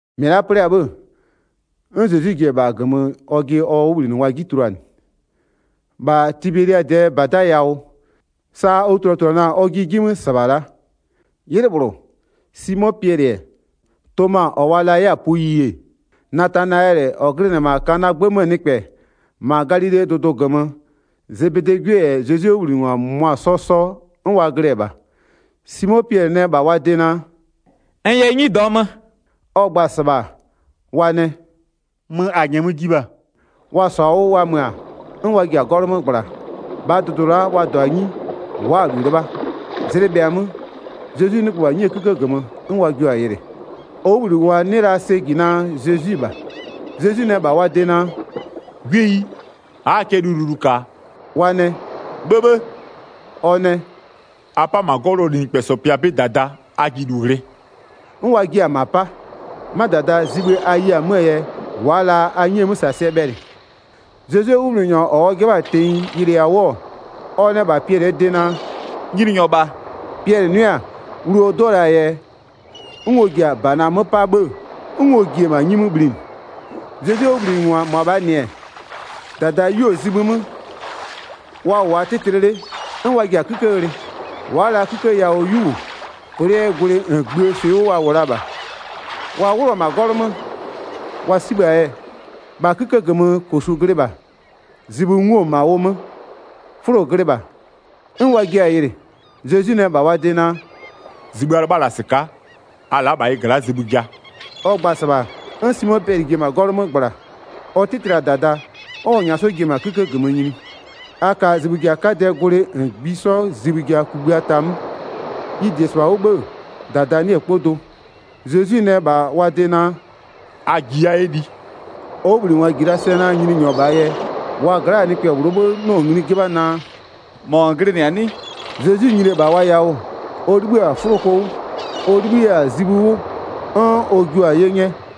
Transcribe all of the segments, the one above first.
1-Mɩ la'a 'plɩ-a 'bhë-ë, 'n Zezwi ji-e -bha -gömö ɔjɩ ɔ 'wʋbhlinɩngwa 'ji tuluanɩ, -bha Tibeliadɩɛ -bada yawʋ. Sa ɔ tuluatuluanʋa-a ɔjɩ 'ji -sɩbha la'a: 'Ylɩ -bhlʋ, Simo Piɛlɩ-ɛ, Toma -ɔ wa la 'yɛ-a puyi-e, Natanayɛlɩ -ɔ glɩnɩ-ɛ -ma Kanaa 'gbë 'möö nɩkpɛ, -ma Galilee dʋdʋ -gömö. Zebedee 'gwie -yɛ Zezwie 'wʋbhlinɩngwa -mʋmʋa 'sɔ 'sɔ 'n wa glɩ-ɛ -bha. Simo Piɛlɩ nɛ -bha wa de naa: “N yɛ 'nyi -dɔɔ mö.” Ɔ gba-a -sɩbha, wa nɛ: “Möö -a -nyɛmö ji -bha.” Wa -sɔ-a 'wʋ wa mö-a, 'n wa ji-a 'gɔlʋ 'mö -gbla. -Bhaa dʋdʋ la'a wa -dɔ-a 'nyi, wa'a-a -lu 'lɩbha. Zlɩ bhɩa-a 'mö, Zezwi 'nɩgbö -bha 'nyie 'kïkë -gömö, 'n wa jio-a yɩlɩ. Ɔ 'wʋbhlinɩngwa 'nɩ la sɛ -ji naa, Zezwi-i -bha. Zezwi nɛ -bha wa de naa: “'Gwieyi, a'aa cɛ lililu -ka-a?” Wa nɛ: “'Bhëbhë!” Ɔ nɛ: “A 'pa -ma 'gɔlʋɔ linɩkpɛsɔ pɩa 'bɩ -dada, a ji -lu ghlɩ.” 'N wa jia-a -ma 'pa. 'Ma -dada, zibhï a ye-a 'möö yɛ wa'a la a 'nyi 'möö -sasɩɛ bhɛlɩ. Zezwie 'wʋbhlinɩnyɔ -ɔ ɔ 'jɩbha-a tenyi yɩlɩɩ-a 'wʋ-ɔ, ɔ nɛ -bha Piɛlɩɛ de naa: “Nyininyɔ -bha.” Piɛlɩ 'nʋɩ-a, wlu ɔ 'dɩɔ la-aa yɛ, 'n ɔ ji-a ɔ -bana 'mö 'pa 'bhë 'n ɔ ji-e -ma 'nyi 'mö bhlinɩ. Zezwie 'wʋbhlinɩngwa -mʋabhaa -nɩ-ɛ, -dada 'yeo-o zibhï 'mö, wa -wʋ-a 'tɩtlɩ 'le, 'n wa ji-a 'kïkë ghlɩ. Wa'a la 'kïkë yawʋ 'yu -wʋ, plɩ'ɩɛ gwlɩ -ngbïë swɩ 'wʋ wa -wʋ la -bha. Wa 'wlʋ-ɔ -ma 'gɔlʋ 'mö, wa 'sibhë-a yɛ, -bha 'kïkë -gömö -kosu glɩ -bha, zibhï 'nguo-o -ma ʋ 'mö, 'fʋlo glɩ -bha, 'n wa jiɩ-a yɩlɩ. Zezwi nɛ -bha wa de naa: “Zibhï a 'lɩbha-a -la -sɩka'a, a la'a -bha ɩ gla'a zibhï ja.” Ɔ gba-a -sɩbha, 'n Simo Piɛlɩ ji-e -ma 'gɔlʋ 'mö -gbla, ɔ 'tɩtlɩ-a -dada 'n ɔ -nyaa 'sɔ ji-e -ma 'kïkë -gömö nyini, a ka zibhï ja 'kadɩɛ gwlɩ -ngbisɔ zibhï ja kugbïa ta 'mö. Ɩ -di-e -sɩbha 'wʋ 'bhë-ë, -dada 'nɩ-ɛ 'kpɔ do. Zezwi nɛ -bha wa de naa: “A ji a 'yɛ li.” Ɔ 'wʋbhlinɩngwa -ji la sɛ naa Nyininyɔ -bhaa yɛ, wa gla'aa nɩkpɛ -bhlʋɔ 'bhë 'nɩɔ-ɔ ngli 'jɩbha naa: “-Mɔ -n glɩnɩ-a 'nɩ?” Zezwi nyini-e -bha wa yawʋ, ɔ 'libhï-a 'fʋloko 'wʋ, ɔ 'libhï 'yɛ-a zibhï 'wʋ 'n ɔ jua-a 'ye 'nyɛ.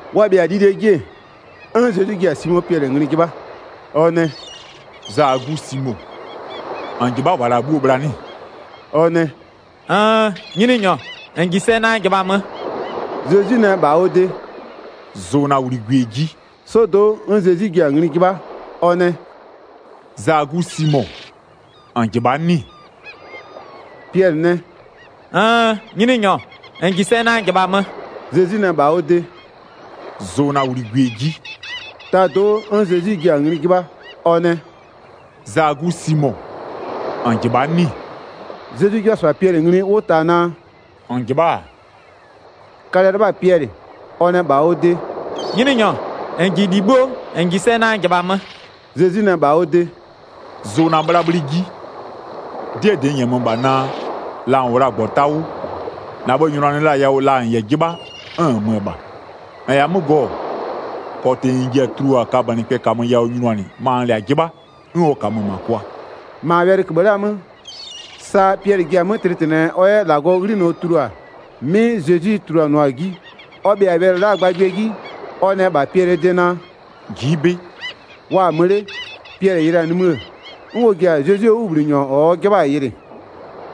Wa bhɩa-a lilie 'ji-e, 'n Zezwi ji-a Simo Piɛlɩ ngli 'jɩbha. Ɔ nɛ: “Zaa 'gu Simo, -n -jɩbha'a -wa la'a 'bhuoo bhla 'nɩ-ɩ?” Ɔ nɛ: “Nn, Nyininyɔ, -n -ji sɛ naa n -jɩbhamö.” Zezwi nɛ -bha ɔ de: “Zʋ na wligwie 'ji.” 'Sɔdo'o, 'n Zezwi jio-a ngli 'jɩbha. Ɔ nɛ: “Zaa 'gu Simo, -n -jɩbha'a 'nɩ-ɩ?” Piɛlɩ nɛ: “Nn, Nyininyɔ, -n -ji sɛ naa n -jɩbhamö.” Zezwi nɛ -bha ɔ de: “Zʋ na 'bhlabhlɩ 'ji.” Tado'o 'n Zezwi jio-a ngli 'jɩbha. Ɔ nɛ: “Zaa 'gu Simo, -n -jɩbha'a 'nɩ-ɩ?” Zezwi 'jɩbha-a -sɩbha Piɛlɩ ngli 'wʋ ta naa: “-N -jɩbha'a-a”, kalɛ-ɛ 'lɩbha-a Piɛlɩ. Ɔ nɛ -bha ɔ de: “Nyininyɔ, -n -ji -li 'bhuo, -n -ji sɛ naa n -jɩbhamö.” Zezwi nɛ -bha ɔ de: “Zʋ na 'bhlabhlɩ 'ji. 'Dɩɛ -dɩ n -nyɛmö -bha naa, la -n -wʋ la-a -gbɔta 'wʋ, -na bhë-ë nyʋnanɩ la-a yawʋ ma -n -yɛ 'jɩbha, 'n -n mö-ö -ma. -N -yɛ-a 'mö gɔ-ɔ, -kɔtɩ -n ji-a tulua kabönɩkpɛ -kamö yawʋ nyʋnanɩ ma -nn -lɛ-a 'jɩbha, 'n ɔ -kamö-ö -ma kwa.” 19-Ma wɛlɩkïbhï la'aa 'mö, sa Piɛlɩ ji-a 'mö tlɩtlɩnɩɛ ɔ 'yɛ -Lagɔɔ 'ghlinɔ tulua, 'mɩ Zezwi tuluanɩɔ-a 'ji. Ɔ bhɩa-a wɛlɩ la'aa gbagbɩɛ 'ji, ɔ nɛ -bha Piɛlɩɛ de naa: “Ji'i 'bɩ.” Wa-a mö 'le, Piɛlɩ yɩlɩ-a nimï-ë, 'n ɔ ji-a Zezwie 'wʋbhlinɩnyɔ ɔ 'jɩbha-a yɩlɩ,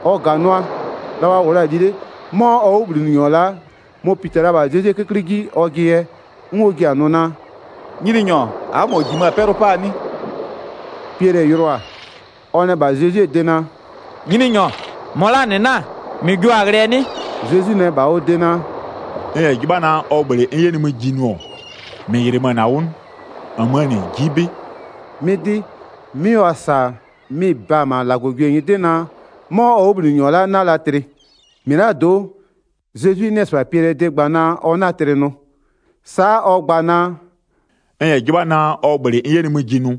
ɔ -ganʋa. La wa -wʋ la-a li 'le, 'mɔ ɔ 'wʋbhlinɩnyɔ la'a mɔ-ɔ pita-a -bha Zezwie 'köklɩ 'ji ɔjɩ yɛ 'n ɔ ji-a nʋ naa: “Nyininyɔ, a'a -mɔ -jimö-a 'pɛlʋ 'paa 'nɩ?” Piɛlɩ yɩlɩɔ-a, ɔ nɛ -bha Zezwie de naa: “Nyininyɔ, -mɔ la'aa -nɩ 'na-a? -Mɩ jio-a ghlɩɛ 'nɩ?” Zezwi nɛ -bha ɔ de naa: “N -yɛ 'jɩbha naa, ɔ -bhlɩ n 'yɛ nimï ji nʋ-ɔ, -mɩ -yɩlɩmö-a 'wʋ 'nɩ? -Nmöö -nɩ, ji'i 'bɩ.” 'Mɩ 'dɩ, 'mɩ wa -sa-a mɩ-ɩ ba-a -ma -Lagɔgwie nyɩdɩ naa, 'mɔ ɔ 'wʋbhlinɩnyɔ la'a 'na la tlɩ. -Mɩlado'o, Zezwi 'nɩɩ-ɩ -sɩbha Piɛlɩɛ de gba naa: “Ɔ 'na tlɩ” nʋ, sa'a ɔ gba la-a naa: “N -yɛ 'jɩbha naa, ɔ -bhlɩ n 'yɛ nimï ji nʋ,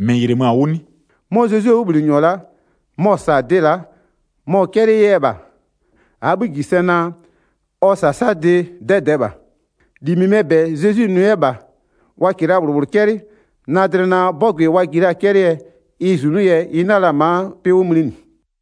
-mɩ -yɩlɩmö-a 'wʋ 'nɩ?” 'Mɔ Zezwie 'wʋbhlinɩnyɔ la'a mɔ-ɔ -sa-a dɩ la'a, mɔ-ɔ 'cɛlɩɩ 'yɛ -bha. -Aa 'bhï -ji sɛ naa, ɔ -sasadɩ 'dɛdɛɛ -bha. 25-Li -mɩmɩɛ -bɛ Zezwi nʋ 'yɛ -bha, wa -kɩɩ la -bhlʋ -bhlʋ 'cɛlɩ, na dlɩ naa 'bɔgʋɩ wa ji la-a 'cɛlɩɛ ɩ -zunʋ yɛ ɩ 'na la ma'a 'pɩ 'wʋ mlinɩ.